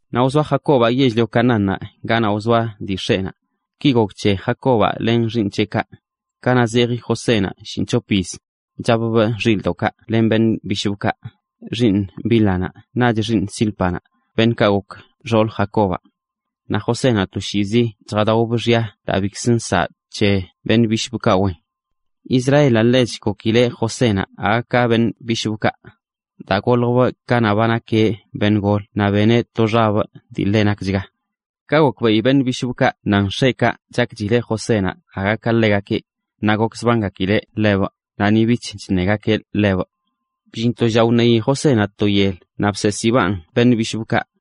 Naꞌ wzoa Jacobaꞌ yell-lio Canaánnaꞌ ganaꞌ wzoa dii x̱eꞌnaꞌ. Ki gok c̱he Jacobaꞌ len xiiṉ c̱heꞌkaꞌ: Kanaꞌ zeji Josénaꞌ shinꞌc̱hop yiz, chapbꞌ xilꞌdoꞌkaꞌ len biꞌ bishꞌbꞌkaꞌ, xiiṉ Bílhanaꞌ naꞌch xiiṉ Zílpanaꞌ, beṉꞌkaꞌ gok xoolə Jacobaꞌ. Naꞌ Josénaꞌ toshiizi chjadaobꞌ xya daa bikzə nsaꞌ c̱he beṉꞌ bishꞌbꞌkaꞌ wen. Israelaꞌ ḻech gokileꞌ Josénaꞌ aga ka beṉꞌ bishꞌbꞌkaꞌ, daa goljbꞌ kanaꞌ ba nakeꞌ beṉꞌ golə naꞌ beneꞌ to xabꞌ dii ḻe nakchga. Ka gokbeꞌi beṉꞌ bishꞌbꞌkaꞌ nan x̱eꞌkaꞌ chakchileꞌ Josénaꞌ aga ka ḻegakeꞌ, naꞌ gokzbangakileꞌ ḻebꞌ naꞌ ni bich chṉegakeꞌ ḻebꞌ. Bllin to lla wṉei Josénaꞌ to yel naꞌ bseesibaꞌn beṉꞌ bishꞌbꞌkaꞌ,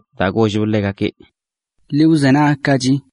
daa gollbꞌ ḻegakeꞌ: ―Ḻi wzenagkachi,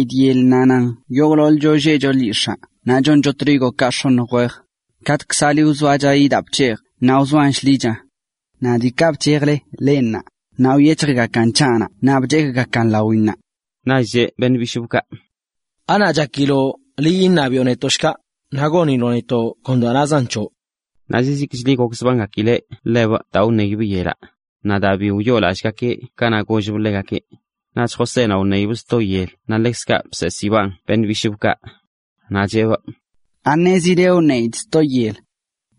nazan yogꞌḻoḻcho lleꞌcho lyix̱aa naꞌ choncho trigokaꞌ x̱oṉj wej, katꞌkzali wzoachayi daa bc̱hejꞌ naꞌ wzoan shḻicha. Naꞌ diikaꞌ bc̱hejle leꞌ ṉaa, wyec̱hjgakan c̱haꞌnaꞌ naꞌ bchekꞌgakan lawinnaꞌ. Naꞌch cheꞌ beṉꞌ bishꞌbꞌkaꞌ: ―¿Anaꞌ chakiloꞌ liꞌ iṉabiꞌo netoꞌ shkaꞌ, naꞌ goniloꞌ netoꞌ kon daa nan c̱hoꞌ? Naꞌ zizikchli gokzbangakileꞌ ḻebꞌ daa wṉeibꞌ yelaꞌ, naꞌ daa bi wyoolallꞌgakeꞌ ka gollbꞌ ḻegakeꞌ. Naꞌch Josénaꞌ wṉeibꞌ sto yel naꞌ ḻekzkaꞌ bseesibaꞌn beṉꞌ bishꞌbꞌkaꞌ. Naꞌ cheꞌbꞌ: ―¿Aṉezile wṉeidꞌ sto yel?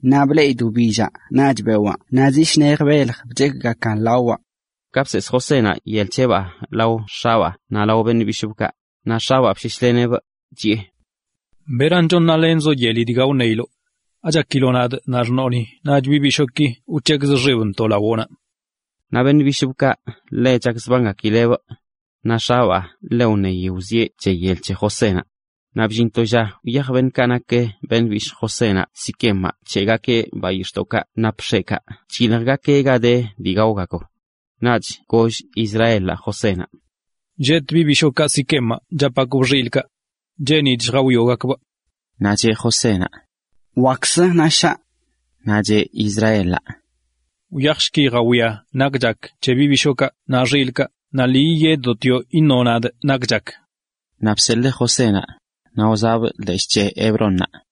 Naꞌ bleꞌidꞌ wbillaꞌ naꞌch bewaa naꞌ zi shnej belj bchekꞌgakan lawaꞌ. Ka bseesꞌ Josénaꞌ yel c̱heꞌbaa lao x̱abaa naꞌ lao beṉꞌ bishꞌbꞌkaꞌ, naꞌ x̱abaa bsheshleneꞌbꞌ, chiꞌe: ―¿Beran chon nalenzoꞌ yeli dga wṉeiloꞌ? ¿Achakiloꞌ nadꞌ, naꞌ xṉoꞌnaꞌ naꞌch beṉꞌ bishooki wc̱hekzꞌ xibntoꞌ lawoꞌnaꞌ? Naꞌ beṉꞌ bishꞌbꞌkaꞌ ḻe chakzbangakileꞌ ḻebꞌ. Naꞌ x̱abaa ḻe wṉeyi wzieꞌ c̱he yel c̱he Josénaꞌ. Naꞌ bllin to lla wyaj beṉꞌkaꞌ nak beṉꞌ bishꞌ Josénaꞌ Siquemaꞌ nc̱heꞌgakeꞌ bayix̱ꞌdoꞌkaꞌ nap x̱eꞌkaꞌ chyiljgakeꞌ ga de dii gaogakb. Naꞌch goll Israelaꞌ Josénaꞌ: ―Lleꞌtꞌ beṉꞌ bishookaꞌ Siquemaꞌ chapgakbꞌ xilꞌkaꞌ. Cheenidꞌ lljawioꞌgakeꞌ. Naꞌ cheꞌ Josénaꞌ: ―Wakkzə, naꞌ shaꞌ. Naꞌ cheꞌ Israelaꞌ: ―Wyajshki, jawia nak chak c̱he beṉꞌ bishookaꞌ naꞌ xilꞌkaꞌ naꞌ lii yiyeddotioꞌ iṉoꞌ nadꞌ nak chak. Naꞌ bseḻee Josénaꞌ, naꞌ wzaꞌbꞌ leshꞌ c̱he Hebrónnaꞌ.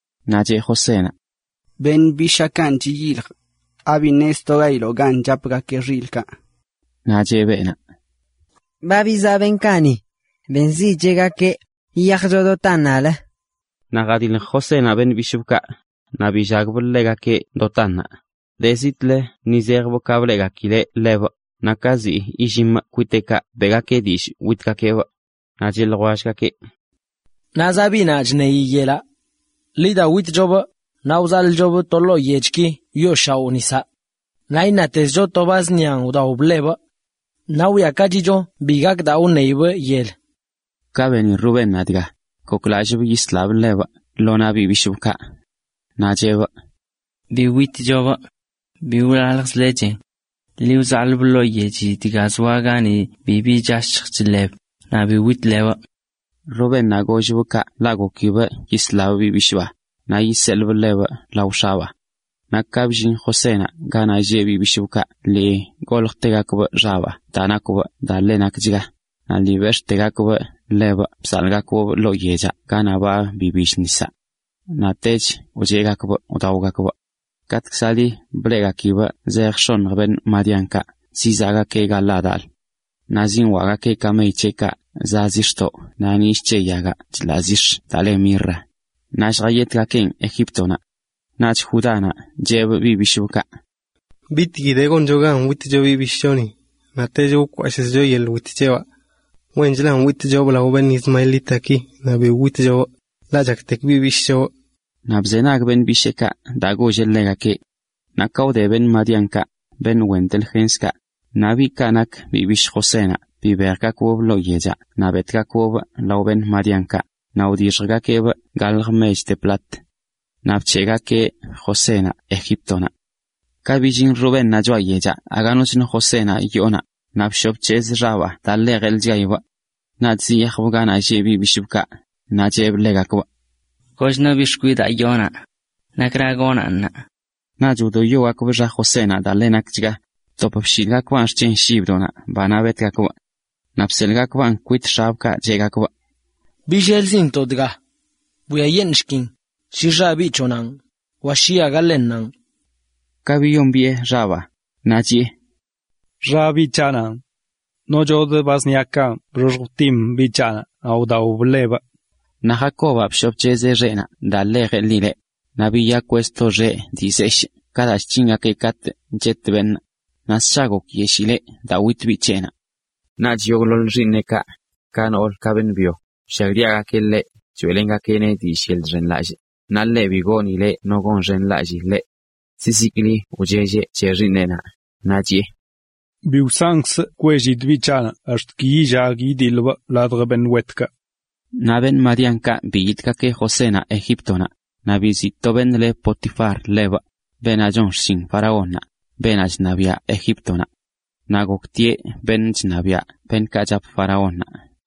Naꞌ cheꞌ Josénaꞌ: ―Beṉꞌ bishaakanꞌ chiyiljꞌ. ¿Abi ṉeztogayiloꞌ gan chapgakeꞌ xilꞌkaꞌ? Naꞌ cheꞌ beenaꞌ: ―Ba bizaꞌ beṉꞌkaꞌ ni. Benzidꞌ cheꞌgakeꞌ: “Yiyajcho Dotánnaꞌlə.” Naꞌ jadilj Josénaꞌ beṉꞌ bishꞌbꞌkaꞌ, naꞌ billagbꞌ ḻegakeꞌ Dotánnaꞌ. De zitꞌlə ni zejbꞌ ka bleꞌgakileꞌ ḻebꞌ, naꞌ ka ziꞌ illimꞌ kwiteꞌkaꞌ beꞌgakeꞌ dillꞌ witgakeꞌbꞌ. Naꞌ cheꞌ ljwellgakeꞌ: ―¡Naꞌ zaꞌ biꞌnaꞌ chṉeyi yelaꞌ! Ḻi da, witchobꞌ naꞌ wzalꞌchobꞌ to ḻoo yechki choll nisaꞌ. Naꞌ iṉatezcho to ba zṉian wdaob ḻebꞌ. Naꞌ wwiakachicho bi gak daa wṉeibꞌ yel. Ka beni Rubénnaꞌ dga, goklalleꞌ yisleꞌ ḻebꞌ lo naꞌ beṉꞌ bishꞌbꞌkaꞌ. Naꞌ chiꞌe: ―Bi witlebꞌ. Ḻi wzaḻꞌbꞌ ḻoo yechi dga zoa gani bibi chashj chḻeb, naꞌ bi witlebꞌ. Rubénnaꞌ golleꞌ kaꞌ ḻaꞌ gokileꞌ yisleꞌ biꞌ bisheenaꞌ, naꞌ yiseḻee ḻebꞌ lao x̱eꞌkaꞌ. Naꞌ ka bllin Josénaꞌ ganaꞌ lleꞌ beṉꞌ bishꞌbꞌkaꞌ lii goljtegakeꞌ xabaa daa nakwbꞌ daa ḻe nakchga, naꞌ lii bex̱ꞌtegakeꞌ ḻebꞌ bzaḻꞌgakeꞌbꞌ ḻoo yechaꞌ ganaꞌ ba bibill nisaꞌ. Naꞌtech wcheꞌgakeꞌ wdaogakeꞌ. Katꞌkzali bleꞌgakileꞌ zejə x̱oṉj madianitakaꞌa zizaꞌgakeꞌ Galaadaꞌlə. Naꞌ zinwaꞌgakeꞌ kamey c̱heꞌkaꞌ za dii chḻaꞌ zix̱ naꞌ nillꞌ c̱he yagaꞌ chḻaꞌ zix̱ daa le mirra kwenc̱he lljayetꞌgakenꞌ Egíptonaꞌ. Naꞌch Judánaꞌ chiꞌe beṉꞌ bisheekaꞌ: ―¿Bitgui de goncho gan witcho biꞌ bishꞌchoni, naꞌch wkwashꞌzcho yeḻꞌ wit c̱hebaꞌ? Wenchlə witꞌchobꞌ lao madianitaki naꞌ bi witchobꞌ, ḻaꞌ chaktek biꞌ bishꞌchobꞌ. Naꞌ bzenag beṉꞌ bisheekaꞌ daa golleꞌ ḻegakeꞌ. Naꞌ ka wde madianitakaꞌb, beṉꞌ wen delgenskaꞌ, naꞌ beṉꞌkaꞌ nak biꞌ bishꞌ Josénaꞌ bibejgakeꞌbꞌ lo yechaꞌ naꞌ betꞌgakeꞌbꞌ lao beṉꞌkaꞌ, naꞌ wdixjgakeꞌbꞌ galj mech de plat. Naꞌ bc̱heꞌgakeꞌ Josénaꞌ Egíptonaꞌ. Ka billin Rubénnaꞌ choꞌa yechaꞌ aga noch no Josénaꞌ yoonaꞌ, naꞌ bshoꞌ bc̱hezꞌ xeꞌnaꞌ daa ḻe jeḻchgayileꞌ. Naꞌch ziyajeꞌ ganaꞌ lleꞌ beṉꞌ bisheekaꞌ, naꞌ chiꞌe ḻegakeꞌ: ―Kochno biꞌ xkwidaa yoo naꞌ. ¿Nakra gonaꞌn ṉaa? Naꞌch wdoyogakeꞌ xa Josénaꞌ daa ḻe nakchga, btop bshilgakeꞌn xc̱hen shibdoꞌ banaꞌ betgakeꞌ. Naꞌ biseḻꞌgakeꞌn kwit x̱eꞌkaꞌ, cheꞌgakeꞌ: “Billelzintoꞌ dga. Bwiayeṉꞌshkin, shi xa biꞌ c̱hoꞌnaꞌn, wa shi aga ḻennanꞌ.” Ka biyombiꞌe xabaa, naꞌ chiꞌe: “Xa biꞌ c̱haꞌnanꞌ. Nochodꞌ ba zṉian bxoxj btim biꞌ c̱haꞌnaꞌ naꞌ wdaob ḻebꞌ.” Naꞌ Jacobaꞌ bshoꞌ bc̱hezꞌ xeꞌnaꞌ daa ḻe jeḻileꞌ, naꞌ biyakweꞌ to xeꞌ dii zeshꞌ daa chc̱hingakeꞌ katꞌ chet beṉꞌ, naꞌ ssha gokyeshiileꞌ daa wit biꞌ c̱heꞌnaꞌ. Naꞌch yogꞌḻoḻ xiiṉeꞌkaꞌ, ka noolə ka beṉꞌ byo, wllagdiagakeꞌ ḻeꞌ, choeꞌlengakeꞌneꞌ dillꞌ yeḻꞌ chxenlallꞌ, naꞌ ḻeꞌ bi gonileꞌ no yiyonxenlallii() ḻeꞌ. Zizikli wchelleꞌ c̱he xiiṉeꞌnaꞌ, naꞌ chiꞌe: “Bi wsankzꞌ kwellidꞌ biꞌ c̱haꞌnaꞌ ax̱t ki yillag yidiḻꞌbꞌ ladj beṉꞌ wetkaꞌ.” Naꞌ madianitakaꞌ biyitꞌgakeꞌ Josénaꞌ Egíptonaꞌ, naꞌ biziꞌ to beṉꞌ le Potifar ḻebꞌ, beenaꞌ chon xshin faraónnaꞌ, beenaꞌ chṉabiaꞌ Egíptonaꞌ. Naꞌ goktieꞌ beṉꞌ chṉabiaꞌ beṉꞌkaꞌ chap faraónnaꞌ.